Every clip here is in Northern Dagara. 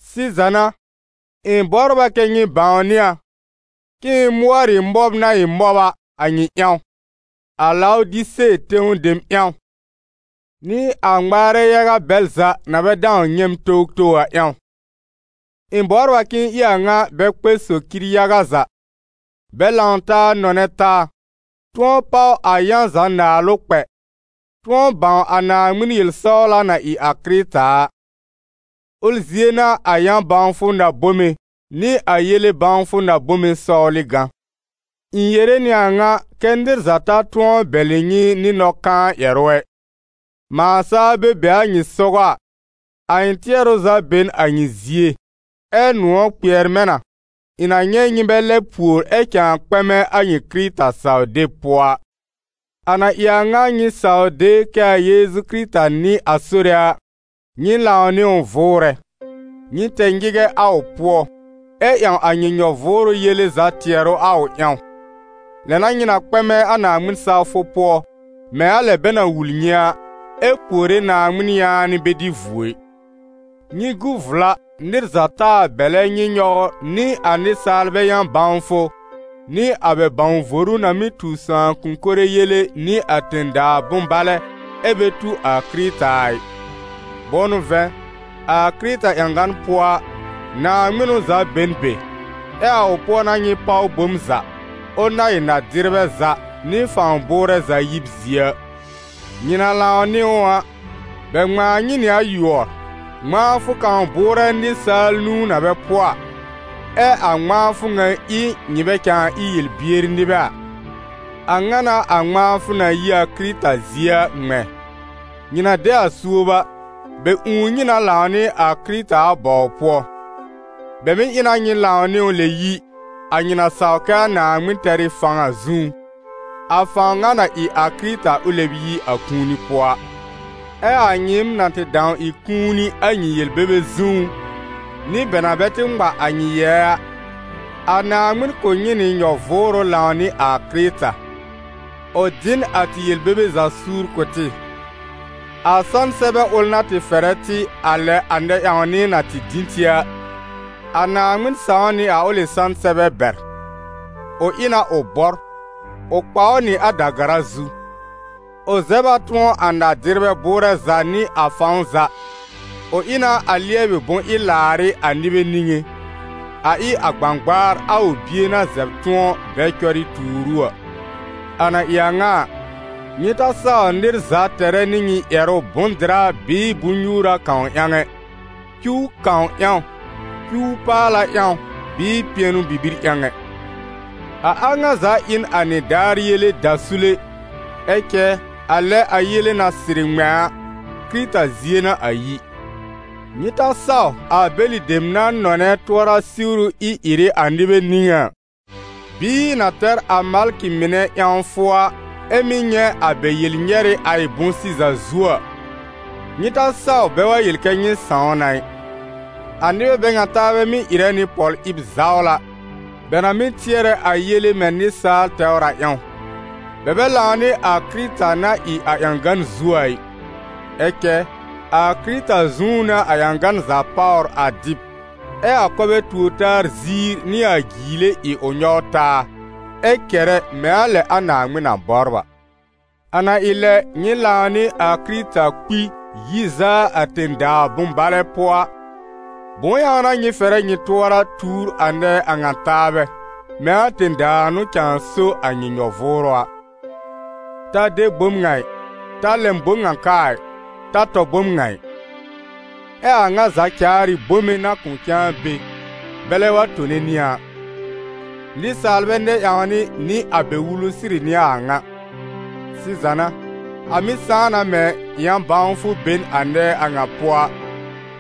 Sɩza n'a, ɩ̃ bɔbr a kɛ́ nyɩ bãwnɩ a, k'ɩ̃ɩ mʋɔr ɩ mɔb na ɩ mɔb a, a nyɩ ƴãw, a Lawdise tẽw dem ƴãw, nɩ a ŋmaarɛ yaga bɛl za na bɛ dãw nyɛ̃ m towtow a ƴãw. Ɩ̃ bɔbr a k'ɩ̃ɩ ɩ a ŋa bɛ kpɛ socir yaga za, bɛ lãw taa nɔnɛ taa, tʋ̃ɔ páw a yã za naalʋ kpɛ, tʋ̃ɔ bãw a Naaŋmɩn yel-sɔwla na ɩ a Kɩrɩta a. Ʋl zie n'a a yã-bãwfʋ na-bome nɩ a yele bãwfʋ na-bome sɔwlɩ gã. Ɩ̃ yere nɩ a ŋa kɛ́ nɩr za ta tʋ̃ɔ bɛlɩ nyɩ nɩ nɔ-kãa ƴɛrʋ ɛ. Mãa saa bɛ be a nyɩ sɔgɔ a, a ɩ̃ tɩɛrʋ za be n a nyɩ zie, ɛ nʋ̃ɔ̀ kpɩɛr mɛ̃ na, ɩ̃ na nyɛ̃ nyɩ bɛ lɛb pùor ɛ cãa kpɛmɛ a nyɩ Kɩrɩta saw-deb pʋɔ a. A na ɩ a ŋa nyɩ saw de kɛ a Yeezu Kɩrɩta n'ɩ a Sore a, nyɩ lãw nɩ ʋ vʋʋrɛ. Nyɩ tɛ nyɩgɛ a ʋ pʋɔ, ɛ ƴãw a nyɩ nyɔ-vʋʋrʋ yele za tɩɛrʋ a ʋ ƴãw, lɛ n'a nyɩ na kpɛmɛ a Naaŋmɩn sawfʋ pʋɔ, mɛ̃ a lɛ bɛ na wul nyɩ a, ɛ puore Naaŋmɩn yaanɩ bɛ dɩ vuo ɩ. Nyɩ gu vla nɩr za taa bɛlɛ nyɩ nyɔwr nɩ a nɩsaalbɛ yã-bãwfʋ nɩ a bɛ bãw-voru na mɩ́ tu sãakʋ̃-kore yele nɩ a tẽ-daa bʋ̃-balɛ, ɛ bɛ tu a Kɩrɩta a ɩ. Bʋ̃ʋ n'ʋ vɛ̃, a Kɩrɩta ƴãgan pʋɔ a, naaŋmɩnʋ za be n be, ɛ a ʋ pʋɔ n'a nyɩ páw bom za, ʋl na ɩ na-dɩrbɛ za nɩ fãw bʋʋrɛ za yib zie a. Nyɩ na lãw nɩ ʋ a, bɛ ŋmãa nyɩ nɩ a yʋɔr, ŋmãafʋ kãw bʋʋrɛ nɩsaal nũu na bɛ pʋɔ a, ɛ a ŋmãafʋ ŋa ɩ nyɩ bɛ cãa ɩ yel-bier nɩbɛ a. A ŋa n'a a ŋmãafʋ na yi a Kɩrɩta zie a ŋmɛ̃. Nyɩ na de a suob a, bɛ ũù nyɩ na lãw nɩ a Kɩrɩta a bɔw pʋɔ. Bɛ mɩ̀ ɩ na nyɩ lãw nɩ ʋ lɛb yi, a nyɩ na saw kɛ a Naaŋmɩn tɛr ɩ fãw a zũú, a fãw ŋa na ɩ a Kɩrɩta ʋ lɛb yi a kũuni pʋɔ a. Ɛ a nyɩɩm na tɩ dãw ɩ kũuni a nyɩ yel-bebe zũú, nɩ bɛ na bɛ tɩ ŋma a nyɩ yɛɛ a, a Naaŋmɩn kʋ̀ nyɩ nɩ nyɔ-vʋʋrʋ lãw nɩ a Kɩrɩta: ʋ dɩ n a tɩ yel-bebe za suur kʋ̀ tɩ. A sãn-sɛbɛ ʋl na tɩ fɛrɛ tɩ, a lɛ a nɛ-ƴãwnɩ na tɩ dĩ tɩ a, a Naaŋmɩn sãw nɩ a ʋlɩ sãn-sɛbɛ bɛr: ʋ ɩ na ʋ bɔr, ʋ kpa ʋ nɩ a da-gara zu. Ʋ zɛb a tʋ̃ɔ a na-dɩrbɛ bʋʋrɛ za nɩ a fãw za, ʋ ɩ na a lɩɛbɩ bʋ̃-ɩ-làarɩ́ a nɩbɛ niŋé, a ɩ a gbãgbaar a ʋ Bie na zɛb tʋ̃ɔ, bɛ cɔrɩ tuur ʋ a. A na ɩ a ŋa a, nyɩ ta saw nɩr za tɛrɛ nɩ nyɩ ƴɛrʋ bʋ̃-dɩra bɩɩ bʋ-nyuura kãw ƴãw ɛ, cuw kãw ƴãw, cuw-paala ƴãw bɩɩ pɩɛnʋ bibir ƴãw ɛ. A a ŋa za ɩ n a nɩdaar yele dasule, ɛ cɛ a lɛ a yele na sɩrɩ ŋmɛ̃ a, Kɩrɩta zie n'a a yi. Nyɩ ta saw a bɛlɩ dem na nɔnɛ tʋɔra-siwru ɩ-ɩrɩ a nɩbɛ niŋé a, bɩɩ na tɛr a malkɩ mɩnɛ ƴãwfʋ a, ɛ́ mɩ́ nyɛ̃ a bɛ yel-nyɛrɩ a ɩ bʋ̃-sɩza zuo a, nyɩ ta saw bɛ wa yel kɛ nyɩ sãw na ɩ. A nɩbɛ bɛ ŋa taabɛ mɩ́ ɩrɛ nɩ pɔl-ɩb zawla, bɛ na mɩ́ tɩɛrɛ a yele mɛ̃ nɩsaal tɛwr a ƴãw. Bɛ bɛ lãw nɩ a Kɩrɩta na ɩ a ƴãgan zu a ɩ. Ɛ cɛ a Kɩrɩta zũú n'a a ƴãgan za páwr a dɩb, ɛ a kɔbɛ tuor-taa ziir nɩ a jiile ɩ ʋ nyɔw taa, ɛ kɛrɛ mɛ̃ a lɛ a Naaŋmɩn na bɔbr a. A na ɩ lɛ nyɩ lãw nɩ a kɩrɩta kpi yi zaa a tẽ-daa bʋ̃-balɛ pʋɔ a, bʋ̃ʋ ƴãw n'a nyɩ fɛrɛ nyɩ tʋɔra tuur a nɛɛ a ŋa taabɛ, mɛ̃ a tẽ-daa n'ʋ cãa so a nyɩ nyɔ-vʋʋrʋ a: ta de bom ŋa ɩ, ta lɛm bom ŋa ka a ɩ, ta tɔ bom ŋa ɩ? Ɛ a a ŋa za caar ɩ bome na kʋ̃ cãa be, bɛlɛ wa tone nɩ a a. Nɩsaalbɛ nɛ-ƴãwnɩ nɩ a bɛ wulu sɩrɩ n'ɩ a a ŋa. Sɩza n'a, a mɩ́ sãá na mɛ̃ yã-bãwfʋ be n a nɛɛ a ŋa pʋɔ a,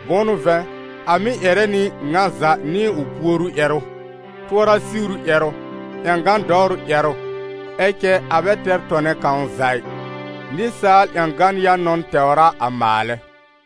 bʋ̃ʋ n'ʋ vɛ̃, a mɩ́ ƴɛrɛ nɩ ŋa za nɩ ʋ puoru ƴɛrʋ, tʋɔra-siwru ƴɛrʋ, ƴãgan dɔwrʋ ƴɛrʋ, ɛ cɛ a bɛ tɛr tɔnɛ kãw za ɩ, nɩsaal ƴãgan yã-nɔn tɛwr a a maalɛ.